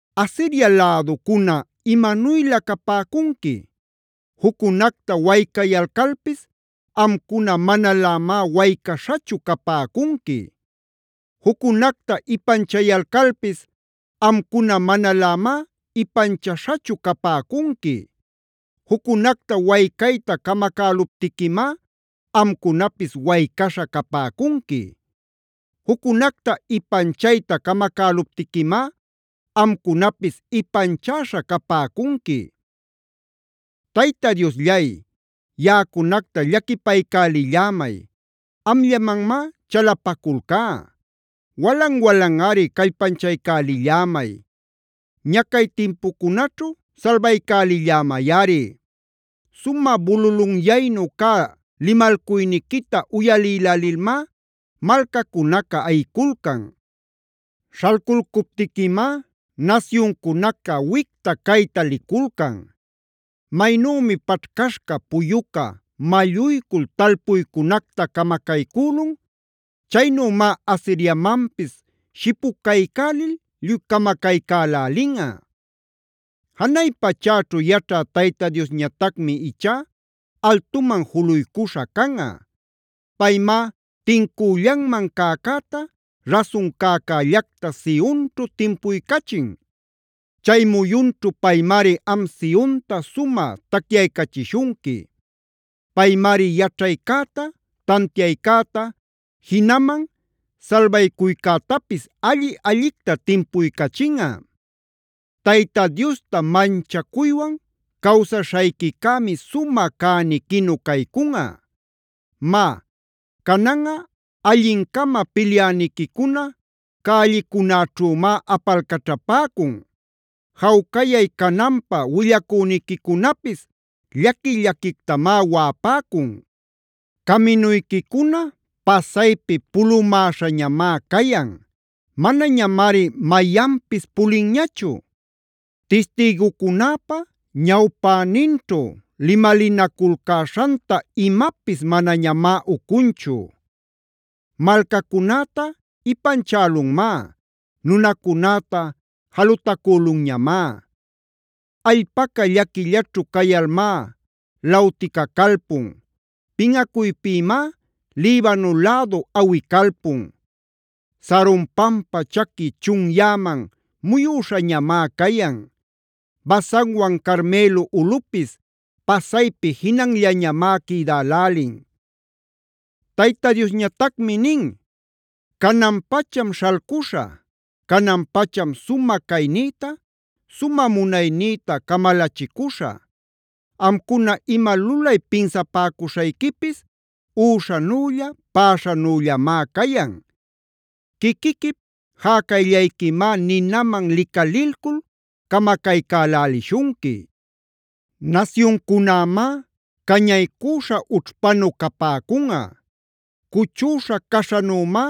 ¡Asiria läducuna imanuylä capäcunqui! Juccunacta waycayalcalpis amcuna, manalämá waycaśhachu capäcunqui. Juccunacta ipanchayalcalpis amcuna, manalämá ipanchaśhachu capäcunqui. Juccunacta waycayta camacäluptiquimá, amcunapis waycaśha capäcunqui. Juccunacta ipanchayta camacäluptiquimá, amcunapis ipanchäśha capäcunqui. Tayta Diosllay, yaꞌacunacta llaquipaycälillämay; amllamanmá chalapaculcá. Walan-walanꞌari callpanchaycälillämay; ñacay timpucunaćhu salbaycälillämayꞌari. Sumä bululunyaynu cä limalcuyniquita uyalïlälilmá malcacunaca ayiculcan. Śhalculcuptiquimá nasyuncunaca wicta-cayta liculcan. Maynümi paćhcaśhca, puyuca malluycul talpuycunacta camacaycülun, chaynümá Asiriamanpis shipucaycälil lluy camacaycälälinꞌa. Janay pachäćhu yaćhä Tayta Diosñatacmi ichá altuman juluycuśha canꞌa. Paymá tincüllanman cäcäta, rasun cäcällacta Sionćhu timpuycachin. Chay muyunćhu paymari am Sionta sumä tacyaycachishunqui. Paymari yaćhaycäta, tantiaycäta, jinaman salbaycuycätapis alli-allicta timpuycachinꞌa. Tayta Diosta manchacuywan cawsaśhayquicämi sumä cäniquinu caycunꞌa. Má, cananꞌa allin-cama pilyäniquicuna cällicunäćhümá apalcaćhapäcun. Jawcayay cananpä willacüniquicunapis llaqui-llaquictamá waꞌapäcun. Caminuyquicuna pasaypi pulumäśhañamá cayan. Manañamari mayanpis pulinñachu. Tistïgucunäpa ñawpäninćhu limalinaculcäśhanta imapis manañamá ucunchu. Malcacunäta ipanchälunmá; nunacunäta jalutacülunñamá. Allpaca llaquillaćhu cayalmá lawticacalpun. Pinꞌacuypïmá Libano lädu awicalpun. Saron pampa chaqui chunyäman muyüśhañamá cayan; Basanwan Carmelo ulꞌupis pasaypi jinanllañamá quïdälälin. Tayta Diosñatacmi nin: “Canan-pacham śhalcuśhä; canan-pacham sumä caynïta, sumä munaynïta camalachicuśhä. Amcuna ima lulay pinsapäcuśhayquipis üśhanülla, päśhanüllamá cayan. Quiquiquip jäcayllayquimá ninaman licalilcul camacaycälälishunqui. Nasyuncunämá cañaycüśha ućhpanu capäcunꞌa. Cuchüśha caśhanümá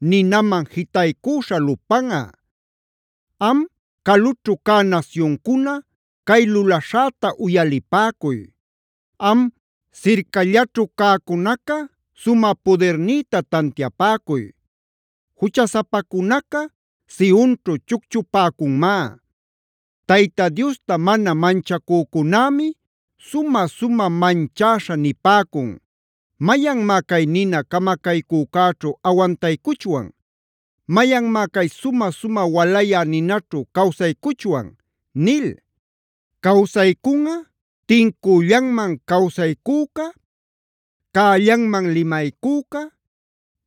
ninaman jitaycüśha lupanꞌa. Am, calućhu cä nasyuncuna cay lulaśhäta uyalipäcuy. Am, sircallaćhu cäcunaca sumä pudirnïta tantiapäcuy. “Juchasapacunaca Sionćhu chucchupäcunmá. Tayta Diosta mana manchacücunämi sumä-sumä manchäśha nipäcun: ‘¿Mayanmá cay nina camacaycücäćhu awantaycuchwan? ¿Mayanmá cay sumä-sumä walayä ninaćhu cawsaycuchwan?’” nil. Cawsaycunꞌa tincüllanman cawsaycüca, cällanman limaycüca,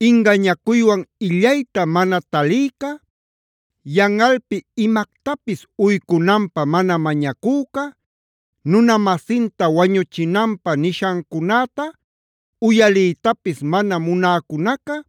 ingañacuywan illayta mana talïca, yanꞌalpi imactapis uycunanpä mana mañacüca, nuna-masinta wañuchinanpä nishancunäta uyaliytapis mana munäcunaca;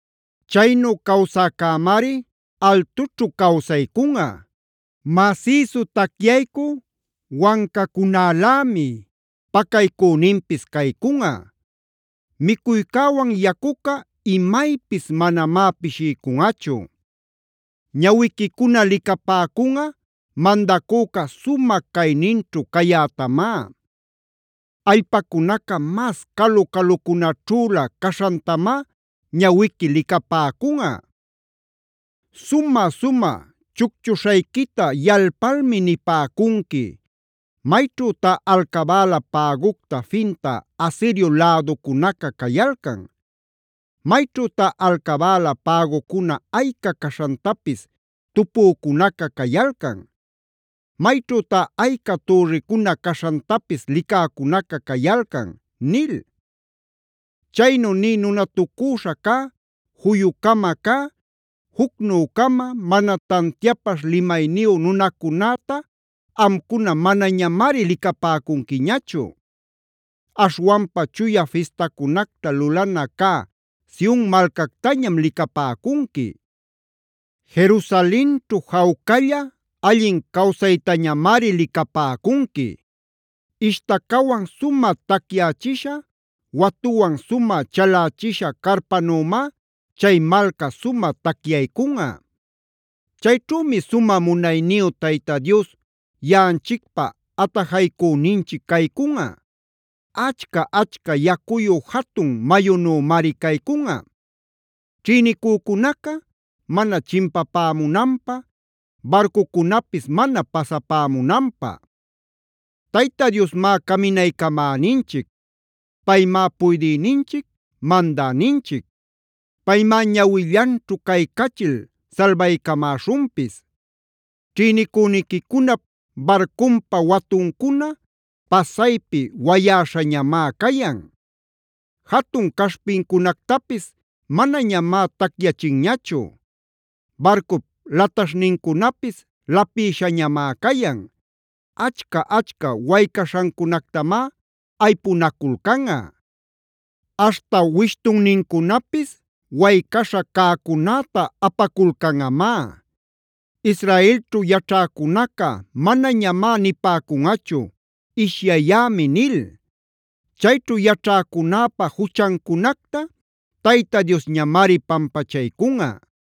Chaynu cawsäcämari altućhu cawsaycunꞌa. Masïsu tacyaycü wancacunälämi pacaycüninpis caycunꞌa. Micuycäwan yacuca imaypis manamá pishiycunꞌachu. Ñawiquicuna licapäcunꞌa mandacüca sumä cayninćhu cayätamá. Allpacunaca mas calu-calucunaćhülä caśhantamá ñawiqui licapäcunꞌa. Sumä-sumä chucchuśhayquita yalpalmi nipäcunqui: “¿Mayćhütá alcabäla pägucta fintä Asirio läducunaca cayalcan? ¿Mayćhütá alcabäla pägucuna ayca caśhantapis tupücunaca cayalcan? ¿Mayćhütá ayca türricuna caśhantapis licäcunaca cayalcan?” nil. Chaynu nï nunatucüśha cä, juyu-cama cä, jucnü-cama, mana tantiapaśh limayniyu nunacunäta amcuna manañamari licapäcunquiñachu. Aśhwanpa chuya fistacunacta lulana cä Sion malcactañam licapäcunqui; Jerusalenćhu jawcalla, allin cawsaytañamari licapäcunqui. Ishtacawan sumä tacyächisha, watuwan sumä chalächisha carpanümá chay malca sumä tacyaycunꞌa. Chayćhümi sumä munayniyu Tayta Dios yaꞌanchicpa atajaycüninchic caycunꞌa. Achca-achca yacuyu jatun mayunümari caycunꞌa ćhïnicücunaca mana chimpapämunanpä barcucunapis mana pasapämunanpä. Tayta Diosmá caminaycamäninchic; paymá puydïninchic, mandäninchic. Paymá ñawillanćhu caycachil salbaycamäśhunpis. Ćhïnicüniquicunap barcunpa watuncuna pasaypi wayäśhañamá cayan. Jatun caśhpincunactapis manañamá tacyachinñachu; barcup lataśhnincunapis lapïshañamá cayan. Achca-achca waycaśhancunactamá aypunaculcanꞌa; aśhta wishtunnincunapis waycaśha cäcunäta apaculcanꞌamá. Israelćhu yaćhäcunaca manañamá nipäcunꞌachu: “Ishyayämi” nil. Chayćhu yaćhäcunäpa juchancunacta Tayta Diosñamari pampachaycunꞌa.